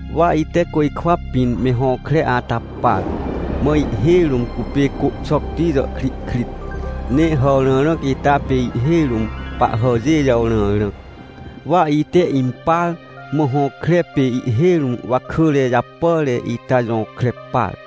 Wa ite côjkwa pĩn me hõkre ata par, mã ihhêj rũm cupê côhxocti jàhkrihkrit, ne hàwrãrãc ita pê ihhêj rũm pahhàjê jàwrãrãc, wa ite impar. Mã hõkre pê ihhêj rũm wakỳre japàre ita jõkre par.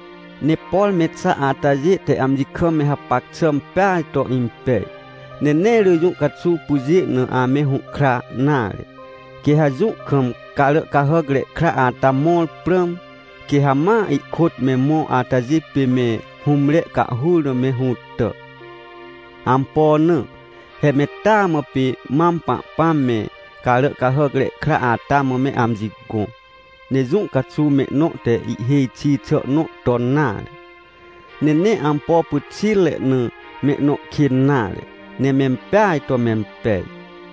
Ne por me xa atajê te amji kam me hapac xà peaj to impej, ne nee rỳ jũ caxuw pyjê na ame hũhkra nare. Quê ha jũ kam Caràcahàcre Kra ata mõr prãm, quê ha ma ihkôt me mõ atajê pê me hũmre cahhur na me hũtà. Ampo na? He me taa mã pê mam Pahpãm me Caràcahàcre Kra ata mã me amji gõ. Ne jũ caxuw mehnõ te ihhêj xi xà nõ ton nare. Ne nee ampo pyxitre na mehnõ kên nare, ne mempeaj to mempej.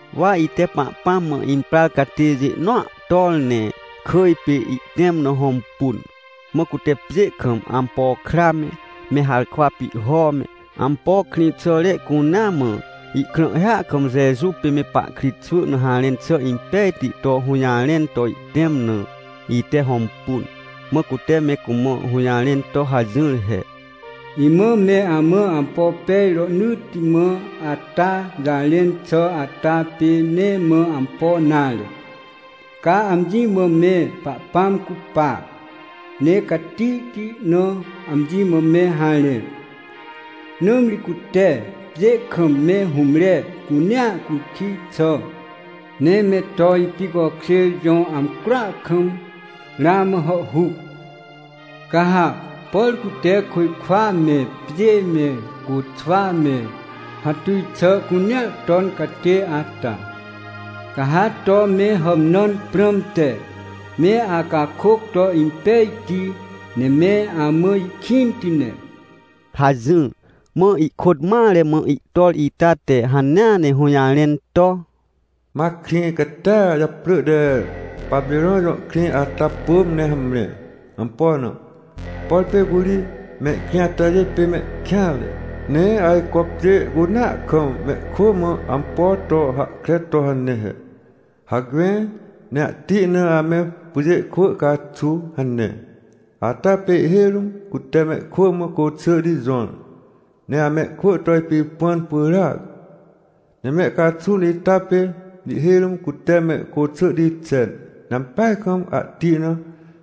Wa ite Pahpãm mã imprar catêjê nõa tor, ne kỳj pê ihtẽm na hõmpun. Mã cute pjê kam ampo kra me, me harkwa pihho me, ampo krĩxàre cunea mã, ihkrãhhia kam Jeju pê me pahkritxwỳ na harẽn xà impejti to hũjarẽn to ihtẽm na, ite hõmpun. Mã cute me cumã hũjarẽn to hajỹr he: — Imã me amã ampo pej rohnỳtti mã ata jarẽn xà ata pê nee mã ampo nare. Ca amji mã me Pahpãm cupa, ne catihti na amji mã me harẽ! Nãmri cute pjê kam me hũmre cunea cukij xà ne me to ipicokjêr jõ amcroa kam ramã hàhhuc. Ca ha, por cute côjkwa me, pjê me, côxwa me, hatuj xà cunea ton catê ata, ca ha to me hàmnãn prãmte me acakôc to impejti, ne me amã ihkĩnti ne — hajỹr. Mã ihkôt mare mã ihtor ita te hanea ne hũjarẽn to: — Ma krĩ catia japrỳ te Papirõn jõ krĩ ata pỳm ne hamre. Ampo na? Por pê curi mehkrĩ atajê pê mehkêanre, ne ajco pjê cunea kam mehkwỳ mã ampo to hahkre to hane he: “Hacme ne ahti na ame pyjê kwỳ caxu” hane. Ata pê ihhêj rũm cute mehkwỳ mã côxỳhti jõr, ne amehkwỳ to ipipãn pyràac. Ne me caxun ita pê ihhêj rũm cute me côxỳhti xen, ne ampeaj kam ahti na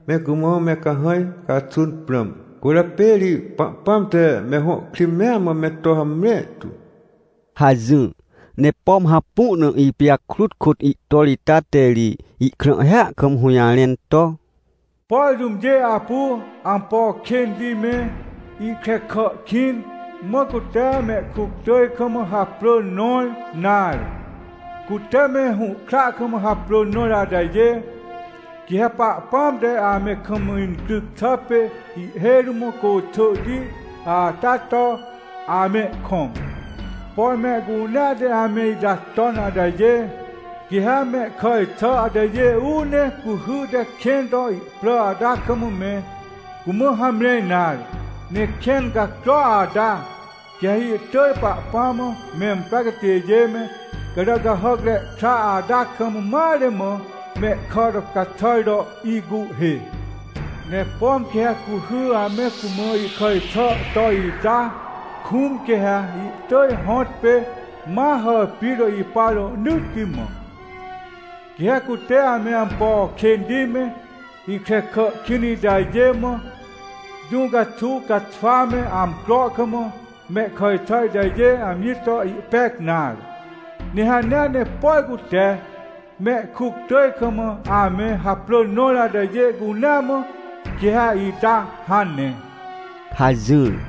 me cumã me cahãj caxun prãm. Cwỳrjapê ri Pahpãm te me hõ krĩ mea mã me to hamre tu — hajỹr. Ne pom hapu na ipijakrut kôt ihtor ita te ri ihkrãhhia kam hũjarẽn to: — Por jũmjê apu ampo kênti me, ihkrekà kĩn, mã cute mehkuctỳj kam haprỳ nõr, nare, cute me hũhkra kam haprỳ nõr atajê, quê ha Pahpãm te ame kam incryc xà pê ihhêj rũm côxỳhti ata to amehkõm. Por mehcunea te ame ita ton atajê, quê ha mehkàj xà atajê uu ne cuhy te kẽn to ihprà ata kam me cumã hamre nare. Ne kẽn cacro ata, quê ha ihtỳj Pahpãm mã memprar catêjê me, Caràcahàcre Kra ata kam mare mã mehkà to caxàr to ihcuhhê. Ne pom quê ha cuhy ame cumã ihkàj xà to ita kũm, quê ha ihtỳj hõtpê ma hàpir to ipa rohnỳtti mã. Quê ha cute ame ampo kênti me, ihkrekà kĩn itajê mã, jũ caxuw caxwa me amcro kam mehkàj xà itajê amji to ihpec nare. Ne hanea ne, por cute mehkuctỳj kam ame haprỳ nõr atajê cunea mã, quê ha ita hane — hajỹr.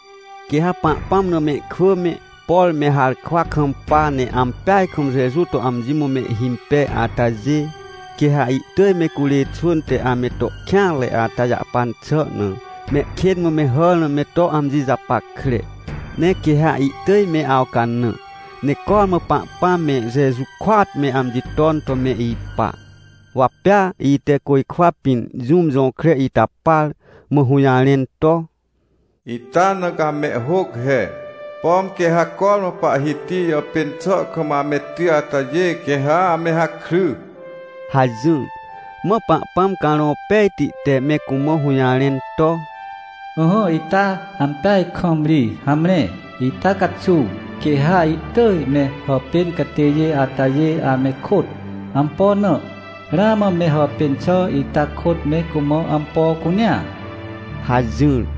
Quê ha Pahpãm na mehkwỳ me, por me harkwa kampa, ne ampeaj kam Jeju to amji mã mehhimpej atajê, quê ha ihtỳj me curê xwỳn te ame to kêanre ata jàhpan xà na, mehkên mã me hàr na me to amji japackre. Ne quê ha ihtỳj me awcanã, ne cormã Pahpãm me Jeju kôat me amji ton to me ipa. Wa pea ite côjkwa pĩn jũm jõkre ita par, mã hũjarẽn to: — Ita na ca mehhôc he: “Pom quê ha cormã Pahhiti jàpên xà kam ame ty atajê quê ha ame hakry” — hajỹr. Mã Pahpãm Carõ Pejti te me cumã hũjarẽn to: — Ỹhỹ, ita ampeaj kam ri. Hamre. Ita caxuw, quê ha ihtỳj me hàpên catêjê atajê ame kôt. Ampo na? Ramã me hàpên xà ita kôt me cumã ampo cunea — hajỹr.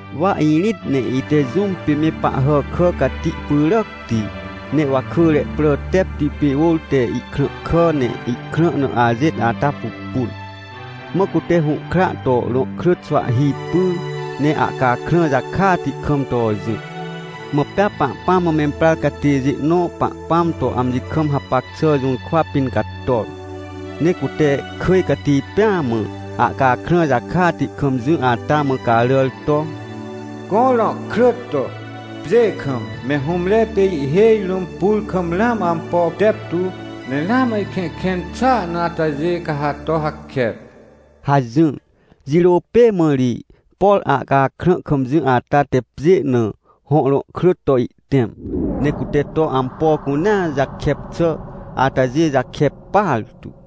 Wa irĩt, ne ite jũm pê me Pahhàkà cati pyràcti, ne wakỳre prà tepti pê ôr te ihkrãhkà ne ihkrã na ajêt ata pupun. Mã cute hũhkra to rõhkrỳt xwahhi pyr ne ahcakrã jakati kam to jỹ. Mã pea Pahpãm mã memprar catêjê nõ Pahpãm to amji kam hapac xà jũrkwa pĩn cator, ne cute kỳj cati pêa mã ahcakrã jakati kam jỹ ata mã caràr to: — Gõ rõhkrỳt to, pjê kam, me hũmre pê ihhêj rũm pur kam ramã ampo teptu, ne ramã ihkẽhkẽn xàa na atajê, ca ha to hakep — hajỹr. Jirô pê mã ri, por ahcakrã kam jỹ ata te pjê na hõ rõhkrỳt to ihtẽm, ne cute to ampo cunea jakep xà atajê jakep partu.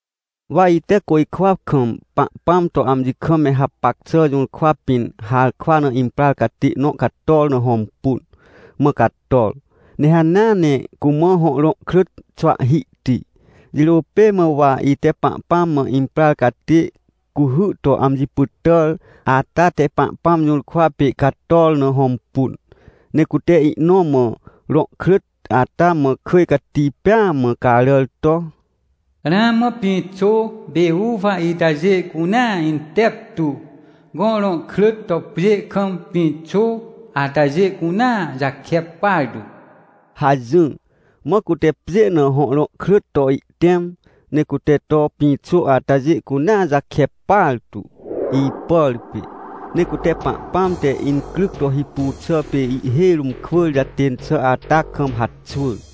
Wa ite côjkwa kam Pahpãm to amji kam me hapac xà jũrkwa pĩn harkwa na imprar catê nõ cator na hõmpun, mã cator, ne hanea ne cumã hõ rõhkrỳt xwahhihti. Jirô pê mã wa ite Pahpãm mã imprar catê cuhy to amji pytàr ata te Pahpãm jũrkwa pê cator na hõmpun. Ne cute ihnõ mã rõhkrỳt ata mã kỳj cati pêa mã caràr to: — Ramã pĩxô pê uwa itajê cunea inteptu, gõ rõhkrỳt to pjê kam pĩxô atajê cunea jakep partu — hajỹr. Mã cute pjê na hõ rõhkrỳt to ihtẽm, ne cute to pĩxô atajê cunea jakep partu, ipàr pê. Ne cute Pahpãm te incryc to hipu xà pê ihhêj rũm kwỳr jatên xà ata kam haxwỳr.